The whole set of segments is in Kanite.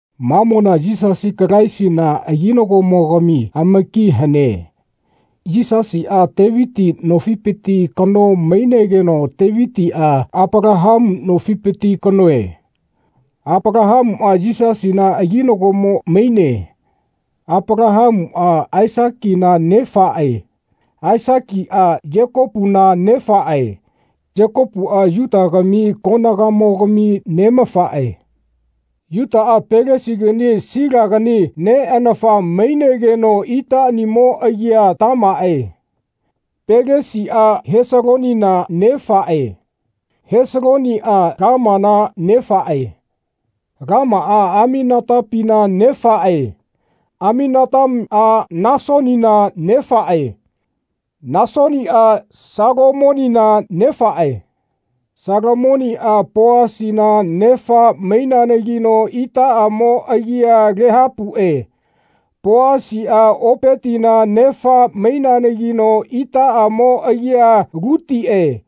Mamona Yisasi Kalaisina aginagomogami amaki hane. Yisasiꞌa Teviti nofipiti kano maineanagino Tevitiꞌa Apalahamu nofipiti kanoe. Apalahamuꞌa Yisasina aginagomo maine. Apalahamuꞌa Aisakina nefaꞌe. Aisakiꞌa Yekopuna nefaꞌe. Yekopuꞌa Yutagami konagamogami neꞌamafaꞌe. Yutaꞌa Pelesigani Silagani neꞌanafa maineanagino itaꞌanimo agia Tamaꞌe. Pelesiꞌa Hesalonina nefaꞌe. Hesaloniꞌa Lamana nefaꞌe. Lamaꞌa Aminatapina nefaꞌe. Aminatamiꞌa Nasonina nefaꞌe. Nasoniꞌa Salamonina nefaꞌe. Salamoniꞌa Poasina nefa maineanagino itaꞌamo agia Lahapuꞌe. Poasiꞌa Opetina nefa maineanagino itaꞌamo agia Lutiꞌe.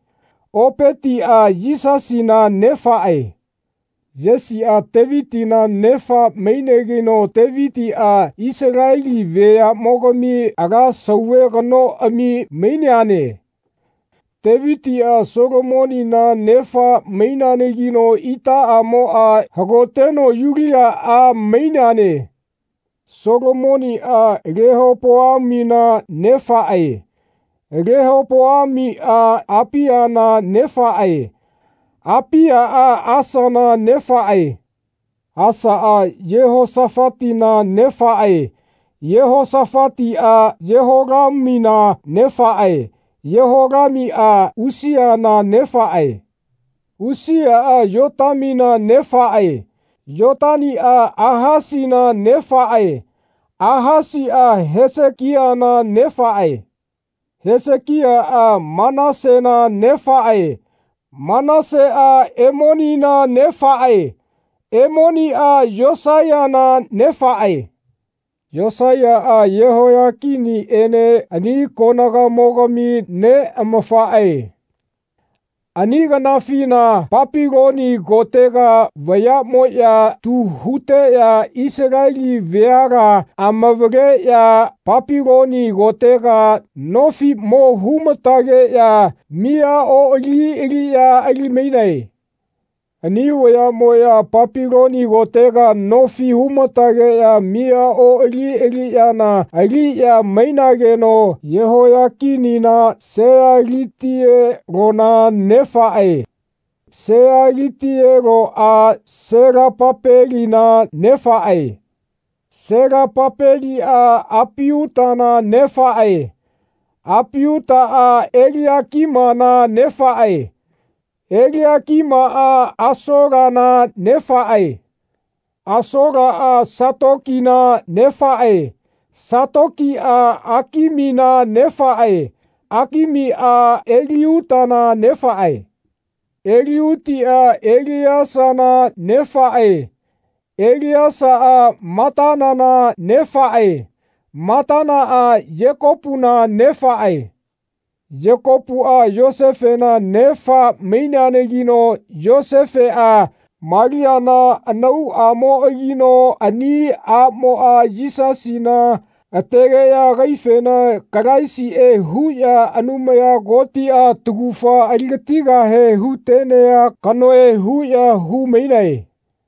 Opetiꞌa Yesina nefaꞌe. Yesiꞌa Tevitina nefa maineanagino Tevitiꞌa Isaleli veaꞌmogami ala sauve kanoꞌami maineane. Tevitiꞌa Solomonina nefa maineanagino itaꞌamoꞌa hagoteno Yulia a maineane. Solomoniꞌa Lehopoamina nefaꞌe. Lehopoamiꞌa Apiana nefaꞌe. Apiaꞌa Asana nefaꞌe. Asaꞌa Yehosafatina nefaꞌe. Yehosafatiꞌa Yeholamina nefaꞌe. Yeholamiꞌa Usiana nefaꞌe. Usiaꞌa Yotamina nefaꞌe. Yotamiꞌa Ahasina nefaꞌe. Ahasiꞌa Hesekiana nefaꞌe. Hesekiaꞌa Manasena nefaꞌe. Manaseꞌa Emonina nefaꞌe. Emoniꞌa Yosaiyana nefaꞌe. Yosaiyaꞌa Yehoiyakiniꞌene ani koganamogami neꞌamafaꞌe. Ani kanafina Papiloni kotega vayaꞌmoꞌya tu huteꞌya Isaleli veala amavaleꞌya Papiloni kotega nofi mo hu-ma-tageꞌya miya oꞌali aliꞌya ali-mainae. Ani veaꞌmoꞌya Papiloni kotega nofi huma-tageꞌya miya oꞌali aliꞌyana aliꞌya mainayanagino Yehoiyakinina Sealitielona nefaꞌe. Sealitieloꞌa Selapapelina nefaꞌe. Selapapeliꞌa Apiutana nefaꞌe. Apiutaꞌa Eliakimana nefaꞌe. Eliakimaꞌa Asolana nefaꞌe. Asolaꞌa Satokina nefaꞌe. Satokiꞌa Akimina nefaꞌe. Akimiꞌa Eliutina nefaꞌe. Eliutiꞌa Eleasana nefaꞌe. Eleasaꞌa Matanana nefaꞌe. Matanaꞌa Yekopuna nefaꞌe. Yekopuꞌa Yosefena nefa maineanagino Yosefeꞌa Maliana anauꞌamoꞌagino ani aꞌmoꞌa Yisasina ategeꞌya agaifena Kalaisiꞌe huꞌya Anumaya Kotiꞌa taugafa aligatigahe hu-tenea kanoe huꞌya hu-mainae.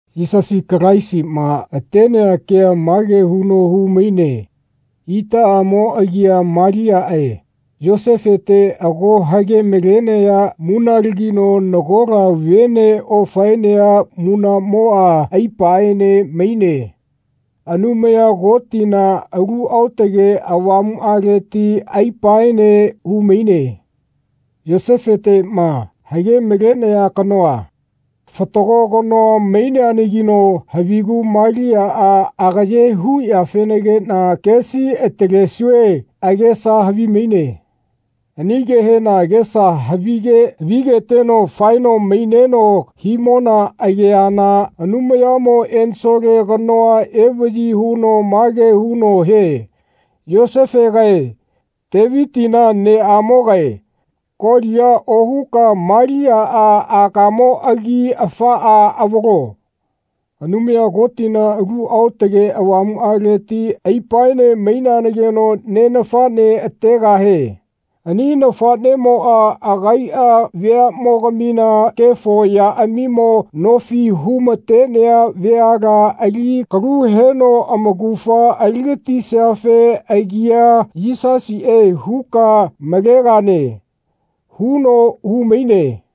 Yisasi Kalaisima atenea kea mage huno hu-maine itaꞌamo agia Maliaꞌe Yosefete ago hage-malenaya munalagino nagola vene ofaenea munaꞌmoꞌa aipaene maine. Anumaya Kotina Alu Aotage Avamuꞌaleti aipaene hu-maine. Yosefeteꞌma, hage-malenaya kanoa, fatago kano maineanagino havigu Maliaꞌa agaye huyafenagiꞌna kesi atalesue agesa havimaine. Ani kehena agesa havige havigeteno faeno maineno himona ageana Anumayamo ensole kanoa evaꞌyi huno mage huno hie “Yosefegae, Tevitina neꞌamogae, kolia ohuka Maliaꞌa akamoꞌagi afaꞌa avalo. Anumaya Kotina Alu Aotage Avamuꞌaleti aipaene maineanagino neꞌnafaꞌne ategahie. Ani nafaꞌneꞌmoꞌa agaiꞌa veaꞌmogamina kefo yaꞌamimo nofi hu-matenea veala ali kalu heno amaugafa ali-gatisiafe agia Yisasiꞌe huka malegane.” huno hu-maine.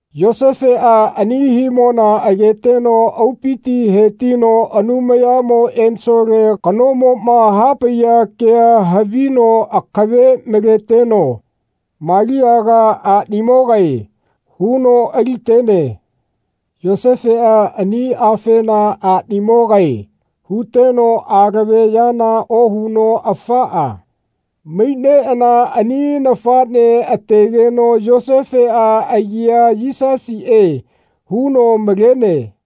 Yosefeꞌa ani himona ageteno aupiti hetino Anumayamo ensole kanomoꞌma hapaiya kea havino akave maleteno “Maliaga aꞌnimogae.” huno ali-tene. Yosefeꞌa ani afena “Aꞌnimogae” huteno alave yana ohuno afaꞌa maineꞌana ani nafaꞌnea ategeno Yosefeꞌa agia Yisasiꞌe huno malene.